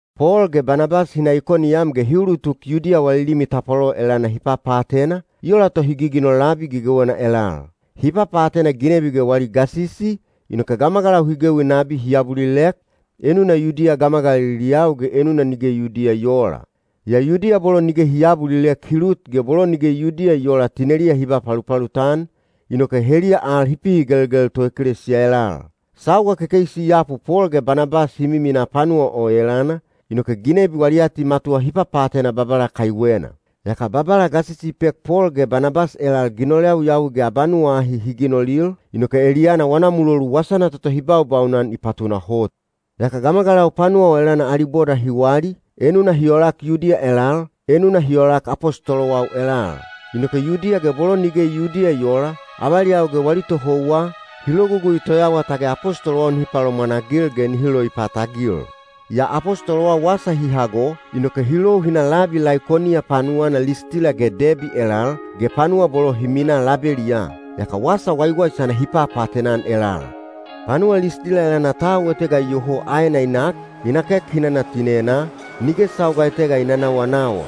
Pol ge Banabas hi na Ikoniyam ge hi ulutuk Yudiya wali limi tapwalolo elana hi papaatena, i ola to hi giginol labi gegewena elal. Hi papaatena ginebi ge wali gasisi, inoke gamagalau hi gewi nabi hi abulilek, enuna Yudiya gamagaliliyau ge enuna nige Yudiya i oola. Yaa Yudiya bolo nige hi aabulilek hi lut ge bolo nige Yudiya i oola tineliya hi ba palupalut-an, inoke heliya al hi pihigelgel toekelesiya elal. Sauga kekeisi i yapu Pol ge Banabas hi miminaa panuwa o elana, inoke ginebi wali atimatuwa hi papaatena Babala kaiwena. Yaka Babala gasisi i pek Pol ge Banabas elal ginol yawiyawi ge abanuwa ahi hi ginolil, inoke eliyana wana mulolu wasana toto hi baubaunan i patunahot. Yaka gamagalau panuwa o elana ali boda hi wali, enuna hi olak Yudiya elal, enuna hi olak apostolowau elal. Inoke Yudiya ge bolo nige Yudiya i oola, avaliyau ge wali tohouwa, hi logugui toyawa tage apostolowau nihi palomwanagil ge nihi loipatagil. Yaa apostolowau wasa hi hago, inoke hi lou hi na labi Laikoniya panuwana Listila ge Debi elal, ge panuwa bolo hi minaa labeliyaa. Yaka wasa waiwaisana hi papaatena-an elal. Panuwa Listila elana tau etega iyoho aena i nak, i nakek hinana tinenaa, nige sauga etega i nanawanawa.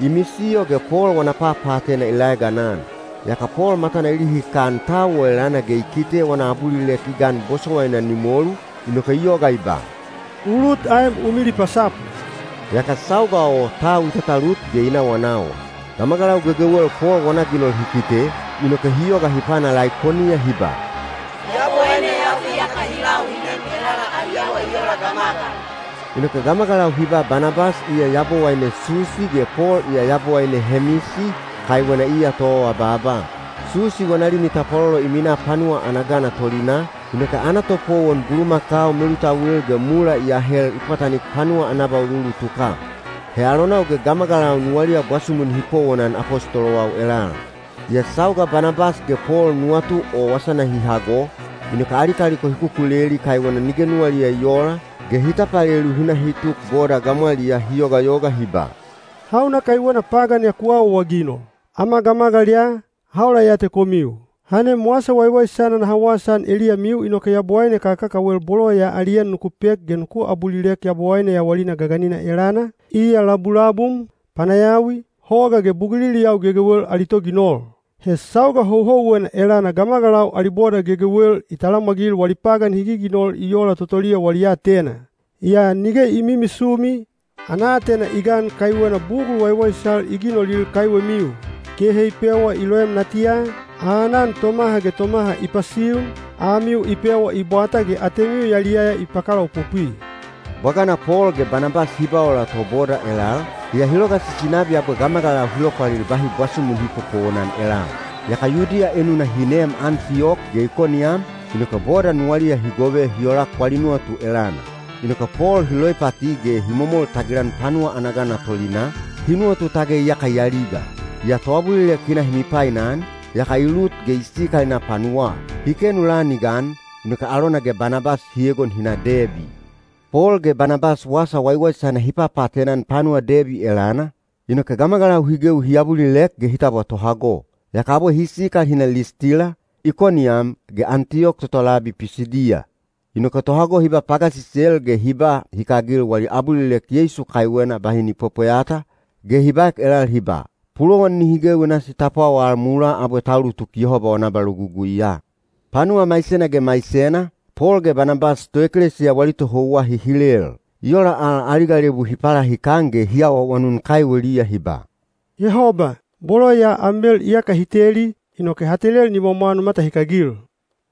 I misiyo ge Pol wana papaatena i laeganan. Yaka Pol matana i lihikan tau o elana ge i kite wana abulilek i gan bosowaina ni molu, inoke i yoga i ba, “U lut aem u milipasapu.” Yaka sauga o tau i tatalut ge i nawanawa. Gamagalau gegewel Pol wana ginol hi kite, inoke hi yoga hi pana Laikoniya hi ba, “Yabowaineyau iyaka hi lau hi nem elala ali awa i ola gamagal.” Inoke gamagalau hi ba Banabas iya yabowaine Susi ge Pol iya yabowaine Hemisi, kaiwena iya toawabaaba. Susi wana limi tapwalolo i minaa panuwa ana gana tolinaa, inoke ana topowon bulumakau melutauil ge mula i ahel i pwatanik panuwa ana abauluulutuka. He alonau ge gamagalau nuwaliya bwasumu nihi powonan apostolowau elal. Yaa sauga Banabas ge Pol nuwatu o wasana hi hago, inoke ali kaliko hi kukuleli kaiwena nige nuwaliya i oola, ge hi tapalelu hi na hi tuk boda gamwaliyaa hi yogayoga hi ba, “Hauna kaiwena pagan ya ku awaawaginol? Ama gamagal ya, ha ola ya te komiu. Ha nem wasa waiwaisana naha wasaan eliyamiu inoke yabowaine kakakawel bolo ya ali en nuku pek ge nuku abulilek Yabowaine yawalina gaganina elana, iya labulabum, panayawi, hoga ge buguliliyau gegewel ali toginol. He sauga houhouwena elana gamagalau ali boda gegewel i talamwagil wali pagan hi giginol i ola totoliya wali aatena. Yaa nige i mimisumi, ana aatena i gan kaiwena bugul waiwaisal i ginolil kaiwemiu: kehe i pewa i loem natiya, aanan tomaha ge tomaha i pasiun, amiu i pewa i bwata ge atemiu yaliyaya i pakalaopopwi.” Bwagana Pol ge Banabas hi ba ola to boda elal, yaa hi logasisi nabi abwe gamagalau hi lopwalil bahi bwasumu nihi popowonan elal. Yaka Yudiya enuna hi neem Antiyok ge Ikoniyam, inoke boda nuwaliya hi gove hi olak wali nuwatu elana. Inoke Pol hi loipati ge hi momol tagilan panuwa ana gana tolinaa, hi nuwatu tage iyaka i aliga. Yaa toabulilek hi na hi mipainan, yaka i lut ge i sikal i na panuwaa. Hi kenu lan i gan, inoke alona ge Banabas hi egon hi na Debi. Pol ge Banabas wasa waiwaisana hi papaatena-an panuwa Debi elana, inoke gamagalau hi gewi hi abulilek ge hi tabwa tohago. Yaka abwe hi sikal hi na Listila, Ikoniyam, ge Antiyok toto labi Pisidiya. Inoke tohago hi ba pagasisel ge hi ba hikagil wali abulilek Yeisu kaiwena bahi ni pwepweyata, ge hi baek elal hi ba, “Pulowan nihi gewi nasi ta pwawal mulaa abwe ta ulutuk Yehoba wana abaloguguiya.” Panuwa maisena ge maisena, Pol ge Banabas toekelesiya wali tohouwa hi hilel. I ola al ali galebu hi palahikan ge hi awaawanun kaiweliya hi ba, “Yehoba, bolo ya am mel iyaka hi teli, inoke ha telel nimwamwa nu matahikagil.”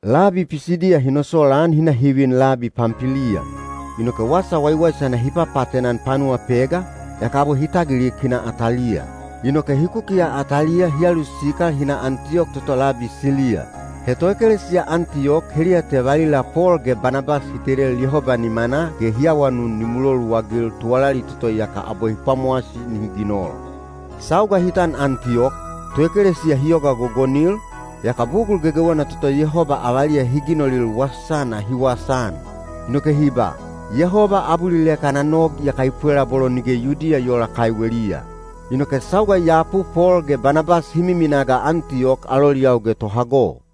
Labi Pisidiya hi nosolaan hi na hi vin labi Pampiliya. Inoke wasa waiwaisana hi papaatena-an panuwa Pega, yaka abwe hi tagilik hi na Ataliya. Inoke hi kukiya Ataliya hi alusikal hi na Antiyok toto labi Siliya. He toekelesiya Antiyok heliya te valila Pol ge Banabas hi telel Yehoba nimanaa ge hi awanun ni muloluagil tuwalali toto iyaka abwe hi pwamowasi nihi ginol. Sauga hi tan Antiyok, toekelesiya hi yoga gogonil, yaka bugul gegewena toto Yehoba avaliya hi ginolil wasana hi wasaan. Inoke hi ba, “Yehoba abulilek ana nog iyaka i pwela bolo nige Yudiya i oola kaiweliya.” Inoke sauga i yapu Pol ge Banabas hi miminaa ga Antiyok aloliyau ge tohago.